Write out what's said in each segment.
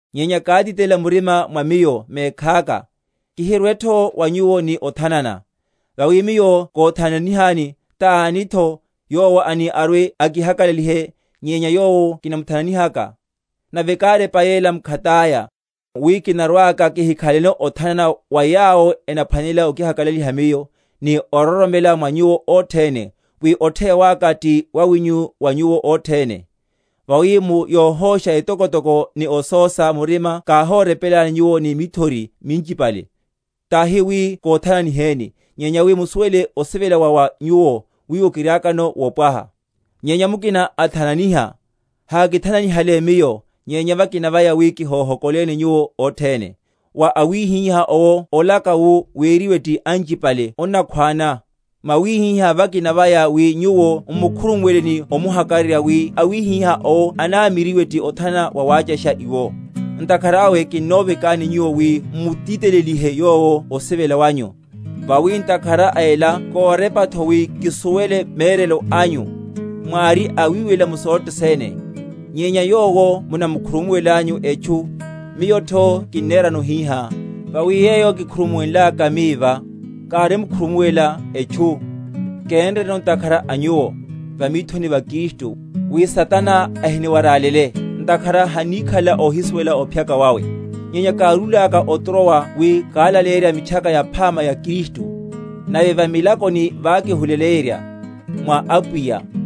Nyenya kátitelela murima mwa miyo mekhaka, kihirwetho wa nyuwo ni othanana. Vawi miyo kóthananihani, tanitho yowo ani arwe‐akihakalalihe, nyenya yowo kimuthananihalaka? Nave kárepa yela mkhataya, wi kinarwaka kihikhaleno othanana wa yawo enaphwanela okihakalaliha miyo; ni ororomela mwa nyuwo othene, wi otheya waka ti wawinyu wa nyuwo othene. Vawi mu yohósha etokotoko ni osósa murima káhórepelani nyuwo ni mithori minchipale; tahi wi kóthananiheni, nyenya wi musuwele osivela wa wa nyuwo, wiwo kiriakano wopwaha. Nyenya mukina athananiha, hakithananihale miyo, nyenya vakina vaya (wi kihohokoleni) nyuwo othene. Wa awihiha owo olaka wu weriwe ti anchipale onnakhwána; mwawihihá vakina vaya wi nyuwo m’mukhurumuwele ni omuhakararya, wi awihiha owo anamiryiwe ti othanana wawáchasha iwo. Ntakhara awe kinnovekani nyuwo wi m’mutitelelihe yowo osivela wanyu. Vawi ntakhara a ela kórepatho, wi kisuwele merelo anyu, mwári awiwelela mu sothe sene. Nyenya yowo munamukhurumuwelanyu etchu, miyotho kinnerano hihá; vawi yeyo kikhurumuwenlaka mi va, kárimkhurumuwela etchu, kénreno ntakhara a nyuwo, va mithoni va Kristu; wi Satana ahiniwarálele; ntakhara hanníkhalela óhisuwela ophyaka wawe. Nyenya kárúlaka o Trowa wi kalaleyerye Mitchaka Yaphama ya Kristu, nave va milakoni vákihule?-?yenryaya, mwa Apwiya,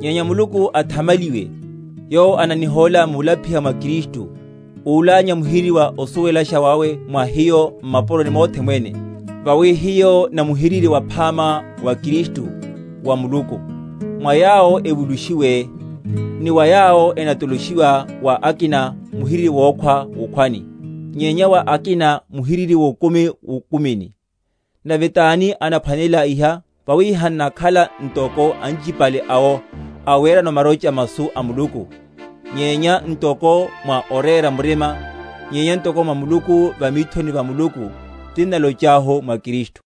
Nyenya Muluku athamaliwe, yowo ananihóla múlapiha mwa Kristu, úlánya muhiriri wa osuwelasha wawe mwa hiyo m’mapuroni mothe mwene. Vawi hiyo na muhiriri waphama wa Kristu, wa Muluku, mwa yawo evulushiwe, ni mwa yawo enatoloshiwa; wa akina muhiriri wokhwa wukhwani; nyenya wa akina, muhiriri wokumi wukumini. Nave tani anaphwanelela iha? Vawi hannakhala ntoko anchipale awo, awerano marocha masu a Muluku; nyenya ntoko mwa orera murima, nyenya ntoko mwa Muluku va mithoni va Muluku, tinnalochahu mwa Kristu.